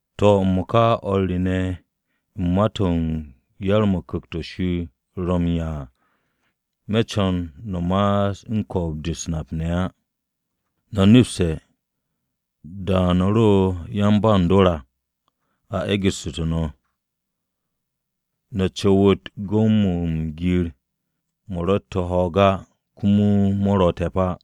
To̱, m-mo̱ka komo o̱r re ne̱ u̱n ma-to̱ u̱n yar-mo̱ Ku̱kt-o̱ Shir ro̱ m-'ya à, me̱ co̱n no̱ ma'as u̱n ko̱o̱b-de u̱s-nap ne̱ á. No̱ nepste̱ da-o̱ no̱ ro yan-ba u̱n dor á, a e̱gu̱ssu̱tu̱ no̱, no̱ cu̱wu̱t gu̱w-mo̱ u̱n gir-mo̱ ro̱tte̱ ho̱o̱g á komo mo̱ ro̱ te̱p á.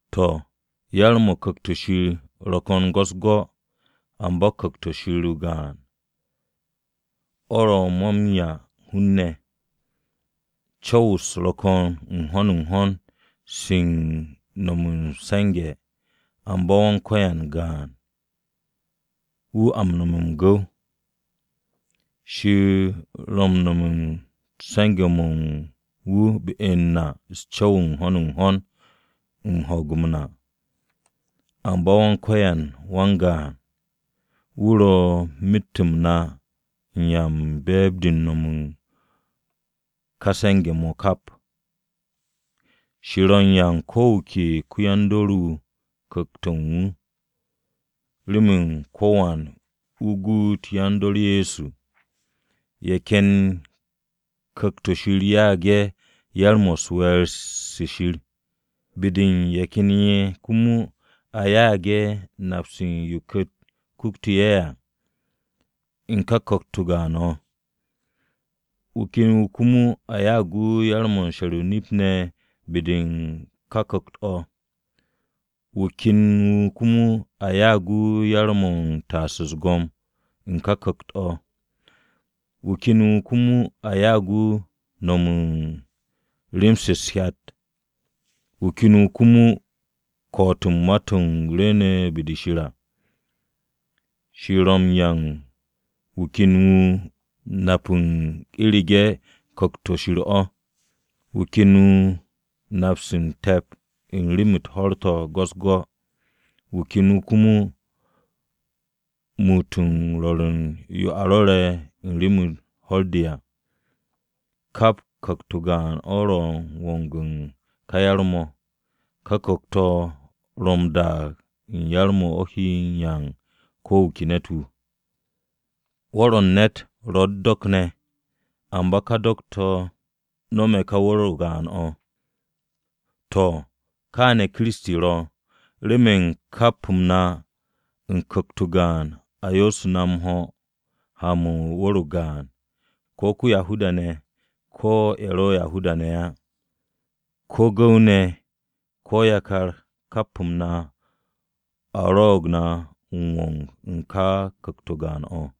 To̱, yar-mo̱ u̱n Ku̱kt-o̱ Shir ro̱ ko̱n go̱-u̱s-go̱, amba Ku̱kt-o Shir o-gaan, o̱ ro̱ mo̱ m-'ya u̱n hun-ne̱. Co̱w-u̱s ro̱ ko̱n n-ho̱n n-ho̱n se u̱n no̱m m-se̱nge̱, amba Wan-Ko̱yan gaan, wu̱ a m-nome̱ m-gu̱w. Shir ro̱ u̱n no̱m u̱n se̱nge̱-mo̱ u̱n wu̱ be-u̱r na u̱s-co̱w n-ho̱n n-ho̱n u̱n ho̱o̱g-m na. Amba Wan-Ko̱yan wan-gaan, wu̱ ro̱ myet-m na u̱n ya-u̱r-be̱e̱b u̱n no̱m mo̱ u̱n ká se̱nge̱-mo̱ kap. Shir ro̱ u̱n 'ya u̱n ko̱ wu̱ ke ko-yan-dor-wu̱ Ku̱kt-o̱ u̱n wu̱, remen ko̱wan wu̱ guut yan-dor Ye̱so. Ye̱ ken ye̱ Ku̱kt-o̱ Shir ya'ag ye̱ yar-mo̱ u̱n we̱e̱r-se Shir, be-de u̱n ye̱ ken ye̱ komo a ya'ag ye̱ nap u̱n yo Ku̱kt-o kutu̱ ye̱ à, u̱n ká Ku̱kt-o gaan-o̱. Wu̱ ken wu̱ komo a ya'ag wu̱ yar-mo̱ m-she̱r o-nip ne̱ be-de u̱n ká Ku̱kt-o̱. Wu̱ ken wu̱ komo a ya'ag wu̱ yar-mo̱ u̱n taas u̱s-go̱m u̱n ká Ku̱kt-o̱. Wu̱ ken wu̱ komo a ya'ag wu̱ yar-mo̱ u̱n no̱m u̱n rem-se u̱t-hyat, wu̱ ken wu̱ komo ko̱'o̱t u̱n ma-to̱ rwu̱u̱ne̱ be-de Shir à. Shir ro̱ m-'ya u̱n wu̱ ken wu̱ nap-se u̱n nap u̱n u̱rege̱ ku̱kt-o̱ Shir o̱, wu̱ ken wu̱ nap-se te̱p u̱n rem-u̱t ho̱r-to̱ go̱-u̱s-go̱, wu̱ ken wu̱ komo muut m-rwo̱r u̱n yo a rwo̱re̱ u̱n rem-u̱r ho̱r-de à. Kap Ku̱kt-o gaan-o̱ ro̱ m-wong u̱n ka yar-mo̱. Ka Ku̱kt-o̱ ro̱ m-daag u̱n yar-mo̱ o̱ he 'ya u̱n ko̱ wu̱ ke ne̱t-wu̱. Wu̱r-o̱ u̱n ne̱t ro̱ u̱t-do̱k ne̱, amba ka do̱k-to̱ no̱me̱ ka wu̱r-o o-gaan o̱. To̱, kaane̱ Kiristi ro̱. Remen kap-m na u̱n Ku̱kt-o gaan a yo'ostu̱ na m-ho̱ ha-mo̱ u̱n wu̱r-o gaan, ko̱ Yahuda-ne̱ ko̱ ye̱ ro̱ Yahuda-ne̱ á, ko̱ gu̱w-ne̱ ko̱ yakar kap-m na a rwo̱'o̱g na m-wong u̱n ka Ku̱kt-o gaan-o̱.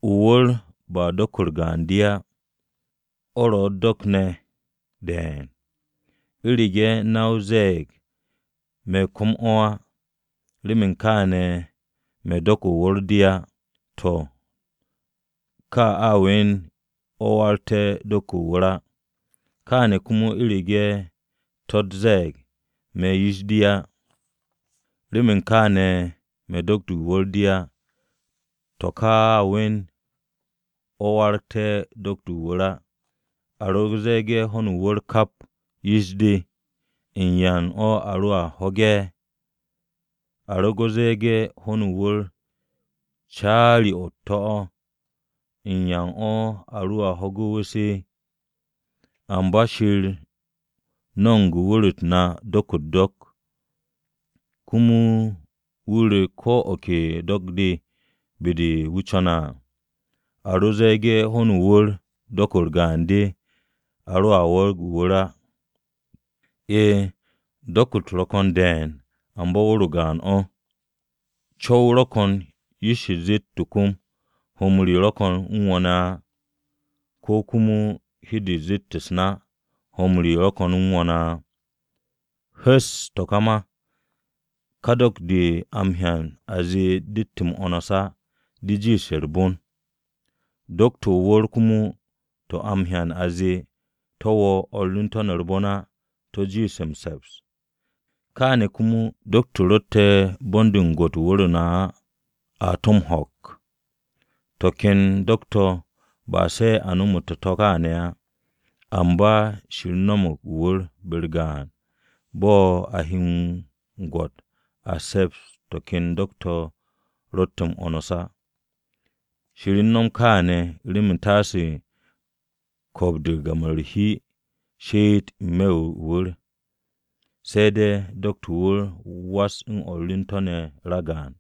O-wu̱r ba do̱k-u̱r gaan-de á, o̱ ro̱ u̱t-do̱k ne̱ de̱e̱n. U̱rege̱ na-o ze̱e̱g, “Me̱ kom-o̱ á, remen kaane̱ me̱ do̱k-de o-wu̱r de á.” To̱ ka a we̱n o̱ m-warag do̱k-de o-wu̱r á. Kaane̱ komo u̱rege̱ to̱-o ze̱e̱g, “Me̱ yish-de á, remen kaane̱ me̱ do̱k-de o-wu̱r de á,” to̱ ká we̱n o̱ m-warag do̱k-de o-wu̱r á. A ro ze̱e̱ge̱ hon o-wu̱r kap yish-de, ¿u̱n yan a roa ho̱ge̱? A ro ze̱e̱ge̱ ho̱n o-wu̱r caari-o̱ o-to̱ o̱, ¿u̱n yan a roa ho̱ge̱ wu̱s? Amba Shir no̱mo̱g wu̱r-u̱t na do̱k-u̱t-do̱k, komo wu̱ ru̱ ko̱ de ke do̱k-de be-de wu̱ co̱ne̱ à. A ro ze̱e̱ge̱ ho̱n o-wu̱r do̱k-u̱r gaan-de, o̱ roa warag o-wu̱r á. E̱e̱, do̱k-u̱t ro̱ ko̱n de̱e̱n, amba wu̱r-o gaan-o̱. Co̱w-o ro̱ ko̱n yish-de zeet o-kom, “Ho̱-m re ro̱ ko̱n u̱n wo̱ ne̱ á,” ko̱ komo hi-de zeet u̱s-na, “Ho̱-m re ro̱ ko̱n u̱n wo̱ ne̱ á.” Hu̱sse̱ to̱ ka ma, ká do̱k-de a m-hyan a zee dett m-'wo̱ns á, to̱ de jiishe̱ u̱r-bon. Do̱k-to̱ o-wu̱r komo to̱ a m-hyan a zee to̱ wo̱o̱ o̱r u̱n to̱ ne̱ u̱r-bon á to̱ a jiishe̱ m-se̱ps. Kaane̱ komo do̱k-to̱ ro̱tte̱ bon-de m-gwo̱t u̱n wu̱r-u̱t na á, a to̱ m-ho̱k. To̱ ken do̱k-to̱ ba se̱ a nomote̱ to̱ kaane̱ á. Amba Shir no̱mo̱g o-wu̱r be-u̱r gaan bo̱ a he m-gwo̱t a se̱ps to̱ ken do̱k-to̱ ro̱tte̱ m-'wo̱ns á. Shir u̱n no̱m káane̱ remen taase ko̱o̱b-de u̱n gam-o̱ u̱r-hi she'et n-me̱ o-wu̱r, se̱ de̱ do̱k-to̱ o-wu̱r was u̱n o̱r u̱n to̱ ne̱ ragaan.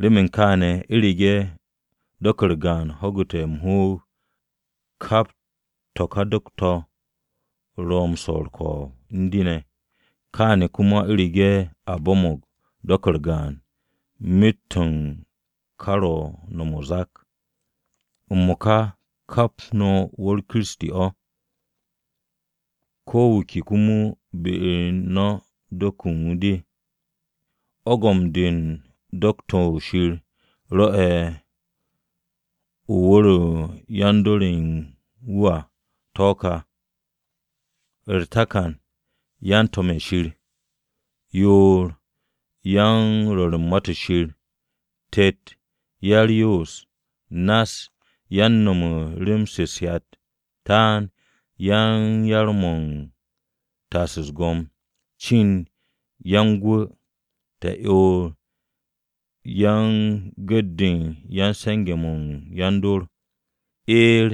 Remen kaane̱ u̱rege̱ do̱k-u̱r gaan ho̱gu̱te̱ m-hoog, kap to̱ ka do̱k-to̱ ro̱ m-swo̱ u̱r-ko̱o̱b u̱n de ne̱. Kaane̱ komo u̱rege̱ a bo̱mo̱g do̱k-u̱r gaan, myet-o̱ u̱n to̱ ka ro̱ u̱n no̱m o-zak. M-mo̱ka kap no̱ wu̱r-o Kiristi o̱. Ko̱ wu̱ ke komo be-u̱r no̱ do̱k-de u̱n wu̱ de. Ogom-de u̱n do̱k-to̱ Shir rwo̱'e̱ u̱n wu̱r-o̱ u̱n yan-dor ye̱ u̱n wu̱ à to̱ ká: U̱r-takan, yan-To̱m Ye̱so. Yoor, yan-Rwo̱r u̱n Ma-to̱ Shir. Tet, ya-u̱r-Yoos. Nass, yan-no̱m u̱n rem-se u̱t-hyat. Taan, yan-yar-mo̱ u̱n taas u̱s-go̱m. Cind, yan-Gwu̱. Ta'yoor, yan-gu̱t-de ya-m-se̱nge̱-mo̱ u̱n yan-dor. Eer,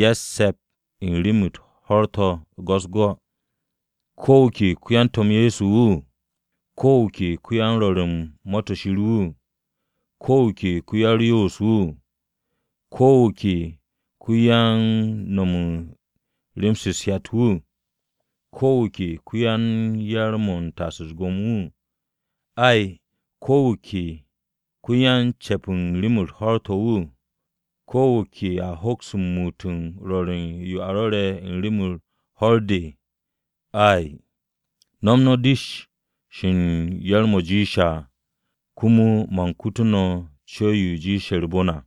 yan-ce̱p u̱n rem-u̱t ho̱r-to̱ go̱-u̱s-go̱. ¿Ko̱ wu̱ ke ko-yan-To̱m Ye̱so wu̱? ¿Ko̱ wu̱ ke ko-yan-Rwo̱r u̱n Ma-to̱ Shir wu̱? ¿Ko̱ wu̱ ke ko-ya-u̱r-Yoos wu̱? ¿Ko̱ wu̱ ke ko-yan-no̱m u̱n rem-se u̱t-hyat wu̱? ¿Ko̱ wu̱ ke ko-yan-yar-mo̱ u̱n taas u̱s-go̱m wu̱? Ay, ¿Ko̱ wu̱ ke ko-ya-m-ce̱p u̱n rem-u̱t ho̱r-to̱ wu̱? ¿Ko̱ wu̱ ke a hoks m-muut m-rwo̱r u̱n yo a rwo̱re̱ u̱n rem-u̱r ho̱r-de? Ay. No̱m no̱ dish-o̱ u̱n yar-mo̱ jiishe̱ à. Komo man kutu no̱ co̱w-yo jiishe̱ u̱r-bon à.